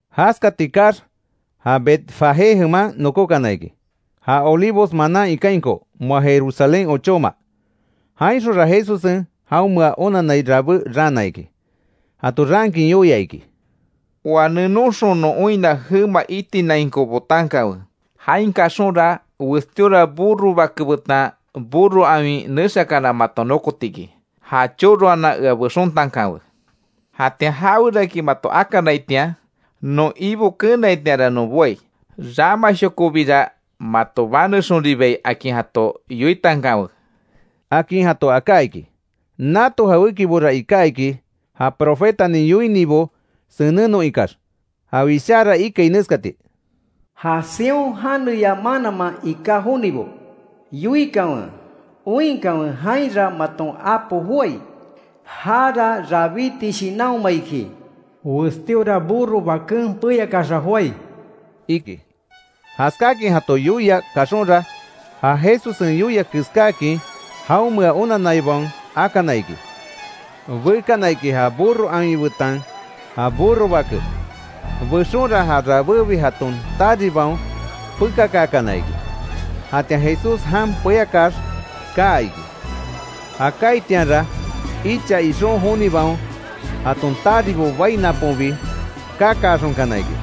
Jaskati kaax, ja Betfagé jeman nokókana iki, ja Olivos manan ikainko, moa Jerusalén ochóma. Jainxonra Jesussen jaonmea onanai rabé raana iki. Jato raankin yoia iki: —Oa nenonxon non oinna jema itinainko botankawe, jain kaxonra, westíora burro bake betan burro awin nexakana maton nokotiki. Ja choroanan ea bexontankanwe. Jatian jaweraki mato akanaitian, non Ibo keenaitianra non boai, ramashokobira mato banexonribai akin jato yoitankanwe —akin jato aká iki. Nato jawékibora iká iki, ja profetanin yoinibo senennon ikax. Ja wishára ikai neskati: “Ja Sión janeya mananman iká jonibo yoikanwe ‘Oinkanwe, jainra maton apo joái. Jara rabiti shinanhoma iki. Westíora burro baken peyakaaxa joái’”, iki. Jaskáakin jato yoia kaxonra, ja Jesussen yoia keskáakin jaonmea onanaibaon akana iki. Bekana iki ja burro awin betan ja burro bake. Bexonra ja rabébi jaton taribaon pekakaakana iki, jatian Jesús jan peyakax kaa iki. Ja kaaitianra, icha ixon jonibaon jaton taribo bai naponbi kakaaxonkana iki.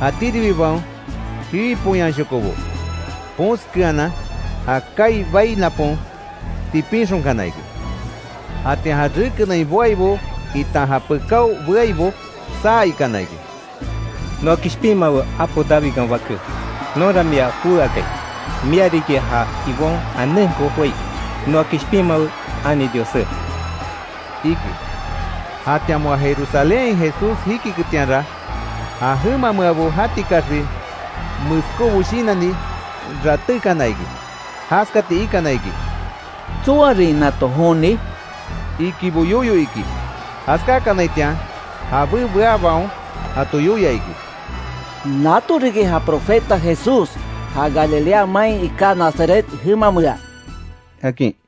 Jatíribibaon, jiwi poyanshokobo ponskeanan, ja kaai bai napon tipinxonkana iki. Jatian ja rekenain boaibo itan já pekao beaibo, saa ikana iki: —¡Noa kishpinmawe apo Davidkan Baké! ¡Nonra mia jowé akai, mia riki ja Ibon janenko joái! ¡Noa kishpinmawe ani Diossé! —iki. Jatian moa Jerusalénhain Jesús jikiketianra, ja jemameabo jatikaxbi meskóbo shinanni ratékana iki. Jaskati ikana iki: —¿Tsoarin nato joni? —ikibo yoyo iki. Jaskákanaitian, jabé beabaon jato yoia iki: —Nato riki ja Profeta Jesús, ja Galilea main iká Nazaret jemamea —akin.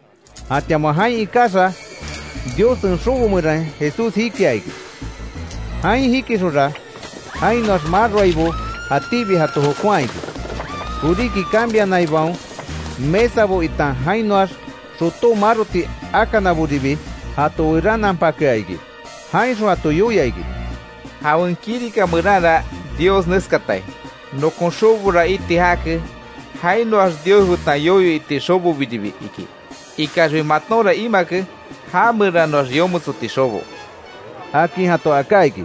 Jatian moa jain ikaxa, Diossen xobo meran Jesús jikia iki. Jain jikixonra, jainoax maroaibo jatíbi jato jokonhaa iki. Koríki cambianaibaon mesabo, itan jainoax xotó maroti akanaboribi jato werananpakea iki. Jainxon jato yoia iki: —Jawen kirika meranra, Dios neskatai: ‘Nokon xobora iti jake, jainoax Dios betan yoyo iti xobobiribi’, iki. Ikaxbi matonra imake, ja meranoax yometsoti xobo —akin jato aká iki.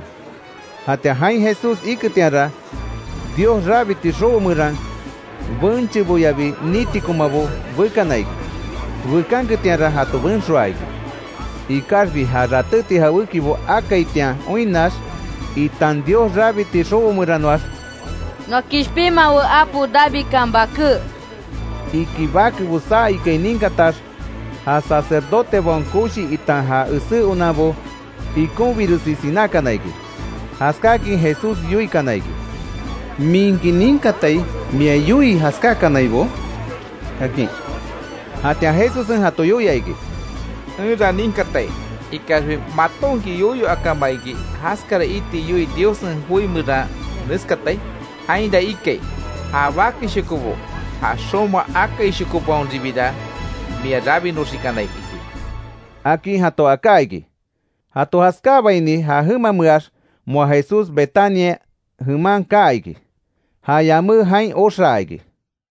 Jatian jain Jesús iketianra, Dios rabiti xobo meran, bencheboyabi nitikomabo bekana iki. Bekanketianra jato benxoaa iki. Ikaxbi ja ratéti jawékibo akaitian oinnax itan Dios rabiti xobo meranoax: “¡Noa kishpinmawe apo Davidkan Baké!” iki bakebo saa ikai ninkatax, ja sacerdotebaon koshibo itan ja esé onanbo, ikonbiresi sinákana iki. Jaskákin Jesús yoikana iki: —¿Minki ninkatai mia yoii jaskákanaibo? —akin. Jatian Jesussen jato yoia iki: —Enra ninkatai. Ikaxbi ¿Matonki yoyo akama iki, jaskara iti yoii Diossen joi meran neskatai? Jainra ikai: ‘Ja bakeshokobo, ja xoma akaishokobaonbira mia rabinoxikanai’, iki —akin jato aká iki. Jato jaskáabaini, ja jemameax moa Jesús Betania jeman kaa iki. Ja yamé jain oxaa iki.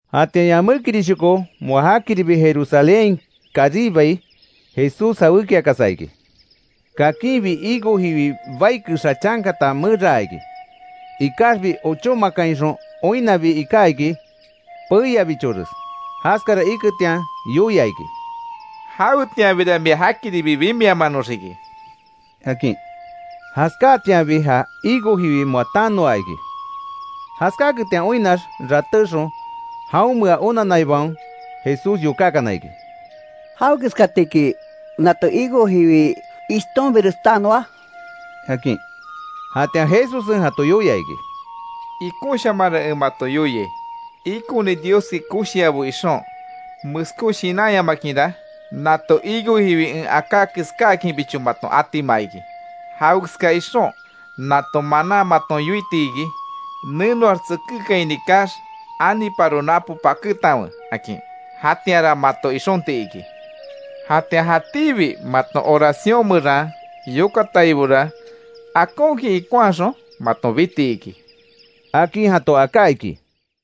Jatian yamékirishoko moa jakiribi Jerusalénhain karibai, Jesús jawékiakasa iki. Kakinbi higo jiwi bai kexa chankata meraa iki. Ikaxbi, ochómakainxon oinnabi iká iki peiabichores. Jaskara iketian yoia iki: —¡Jawetianbira mia jakiribi bimiamanoxiki! —akin. Jaskáatianbi ja higo jiwi moa tanoa iki. Jaskáaketian oinnax ratéxon, jaonmea onanaibaon Jesús yokákana iki: —¿Jawekeskatiki, nato higo jiwi ishtonbires tanoa? —akin. Jatian Jesussen jato yoia iki: —Ikonshamanra en mato yoiai: Ikoni Dioski koshiabo ixon meskó shinanyamakinra, nato higo jiwi en aká keskáakinbicho maton atima iki. Jawekeska ixon, nato manan maton yoiti iki: ‘Nenoax tsekékaini kaax, aniparo napo pakétanwe’, akin. Jatianra mato ixonti iki. Jatian jatíbi maton oracion meran yokataibora, akonkin ikonhaxon maton biti iki —akin jato aká iki.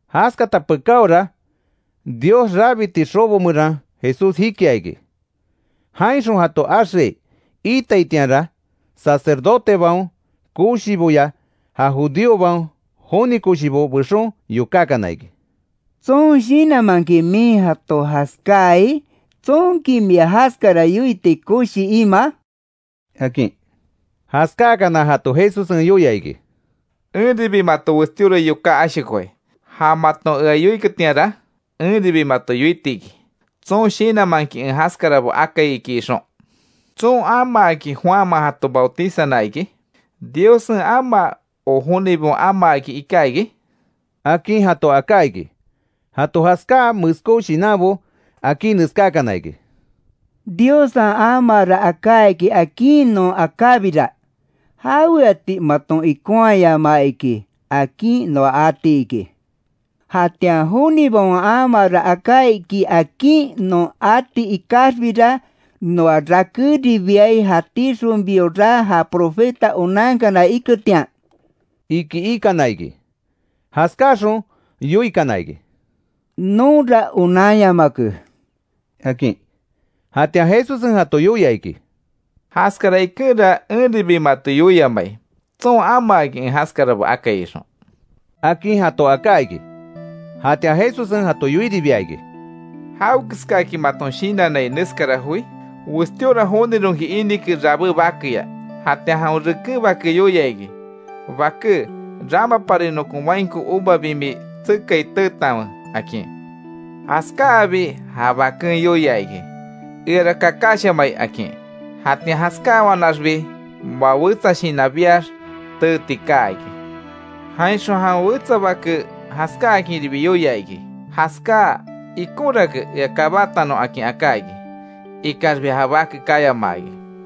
Jaskata pekáora, Dios rabiti xobo meran Jesús jikia iki. Jainxon jato axeai iitaitianra, sacerdotebaon koshiboya, ja judíobaon joni koshibo bexon yokákana iki: —¿Tson shinanmanki min jato jaskáai? ¿Tsonki mia jaskara yoiti koshi imaa? —akin. Jaskáakana, jato Jesussen yoia iki: —Enribi mato westíora yoká ashokoai; ja maton ea yoiketianra, enribi mato yoitiki, tson shinanmanki en jaskarabo akai iki ixon. ¿Tson amaaki, Juanman jato bautizana iki? ¿Diossen amaa, ó jonibaon amaaki iká iki? —akin jato aká iki. Jato jaskáa meskó shinanbo akí neskákana iki: “Diossen amaara aká iki akin non akábira, ‘¿Jaweati maton ikonhayamaa iki?’ akin noa ati iki. Jatian jonibaon amaara aká iki akin non ati ikaxbira, noa rakéribiai, jatíxonbiora já profeta onankana iketian”, iki ikana iki. Jaskáaxon yoikana iki: —Nonra onanyamake —akin. Jatian Jesussen jato yoia iki: —Jaskara ikenra enribi mato yoiamai, tson amaaki en jaskarabo akai ixon —akin jato aká iki. Jatian Jesussen jato yoiribia iki: —¿Jawekeskaki maton shinannai neskara joi? Westíora jonironki inike rabé bakeya. Jatian jawen reken bake yoia iki: ‘Baké, ramapari nokon wainko uva bimi tsekai teetanwe’, akin. Jaskáabi, ja baken yoia iki: ‘¡Eara kakashamai!’ akin. Jatian jaskáawanaxbi, moa wetsa shinan biax teeti kaa iki. Jainxon, jawen wetsa bake jaskáakinribi yoia iki: ‘Jaskáa, ikonrake ea kabatanon’, akin aká iki. Ikaxbi ja bake kayamaa iki.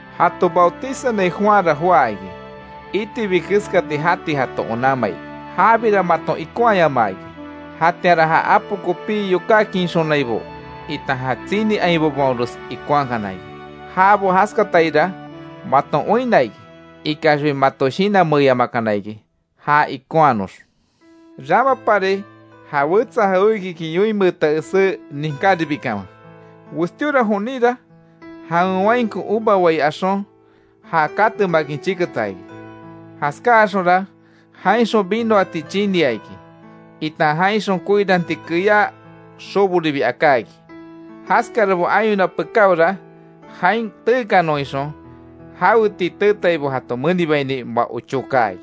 Jato bautizanai Juanra joá iki, itibi keskati jati jato onanmai, jabira maton ikonhayamaa iki. Jatianra, ja apo kopí yokákinxonaibo, itan ja tsini ainbobaonres ikonhakana iki. Jabo jaskataira maton oinna iki. Ikaxbi, mato shinanmeeyamakana iki já ikonhanox. Ramapari ja wetsa jawékiki yoinmeeta esé ninkáribikanwe: Westíora joninra jawen mainko uva wai axon, ja katemakin chiketa iki. Jaskáaxonra jainxon vinoati chinia iki, itan jainxon koiranti keyá xoboribi aká iki. Jaskarabo ayona pekáora, jain teekanon ixon, jaweti teetaibo jato menibaini moa ochó kaa iki.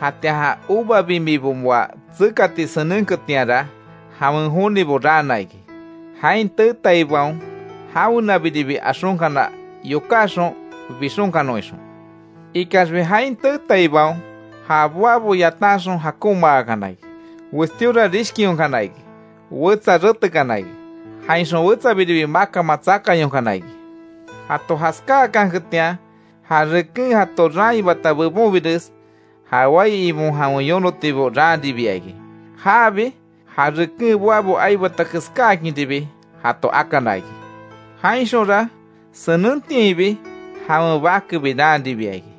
Jatian ja uva bimibo moa tsekati senenketianra, jawen jonibo raana iki, jain teetaibaon jawenabiribi axonkana yokáxon bixonkanon ixon. Ikaxbi, jain teetaibaon ja boabo yatanxon jakonmaakana iki. Westíora rishkionkana iki, wetsa retekana iki, jainxon wetsabiribi makanman tsakayonkana iki. Jato jaskáakanketian, ja reken jato raanhibata bebonbires, ja wai ibon jawen yonotibo raanribia iki. Jaabi, ja reken boabo aibata keskáakinribi jato akana iki. Jainxonra, senentiainbi jawen bakebi raanribia iki.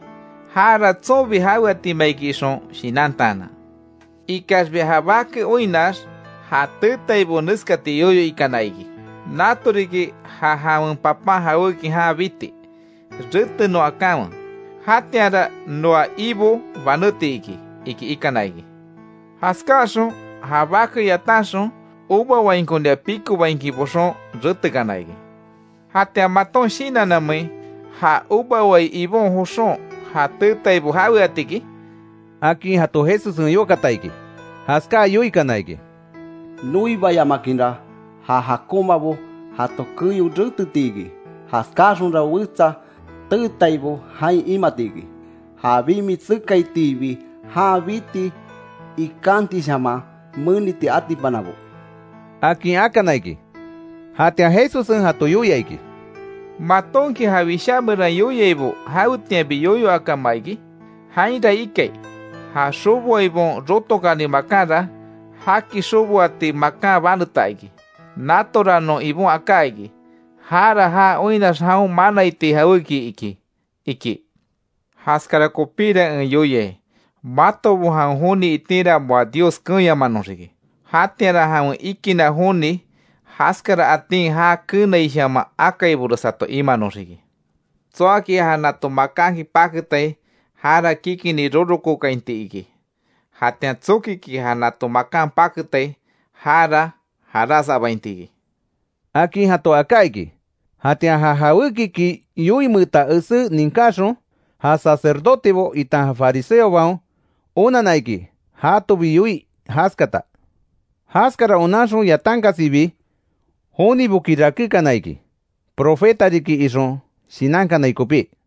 ‘Jara tsonbi jaweatima iki ixon shinantaanan’. Ikaxbi ja bake oinnax, ja teetaibo neskati yoyo ikana iki: ‘Nato riki ja jawen papan jawéki jan biti, retenon akanwe. Jatianra noa ibo banéti iki’, iki ikana iki. Jaskáxon ja bake yatanxon, uva wainkonia pikobainkin boxon retekana iki. ¿Jatian maton shinannamein, ja uva wai ibo joxon ja teetaibo jaweatiki? —akin jato Jesussen yokata iki. Jaskáa yoikana iki: —Noibayamakinra ja jakonmabo jato keyo reteti iki. Jaskáaxonra wetsa teetaibo jain imati iki, ja bimi tsekaitiibi, jan biti ikátiishaman meniti atipanabo —akin akana iki. Jatian Jesussen jato yoia iki: —¿Matonki ja Wishá meran yoiaibo jawetianbi yoyo akama iki? Jainra ikai: ‘Ja xoboaibaon rotokani makanra, jaki xoboati makan baneta iki. Natora non Ibon aká iki, jara ja oinnax jaon manaiti jawéki iki’, iki. Jaskara kopíra en yoiai, matobo jawen joni itinra moa Diossen keenyamanoxiki. Jatianra jawen ikinna joni jaskara atin já keenaishaman akaibores jato imanoxiki. Tsoaki ja nato makanki paketai, jara kikini rorokookainti iki. Jatian tsokiki ja nato makan paketai, jara jaras abainti iki —akin jato aká iki. Jatian ja jawékiki yoinmeeta esé ninkaxon, ja sacerdotebo itan fariseobaon, onanna iki jatobi yoii jaskata. Jaskara onanxon yatankasibi, joniboki rakékana iki, profeta riki ixon shinankanai kopí.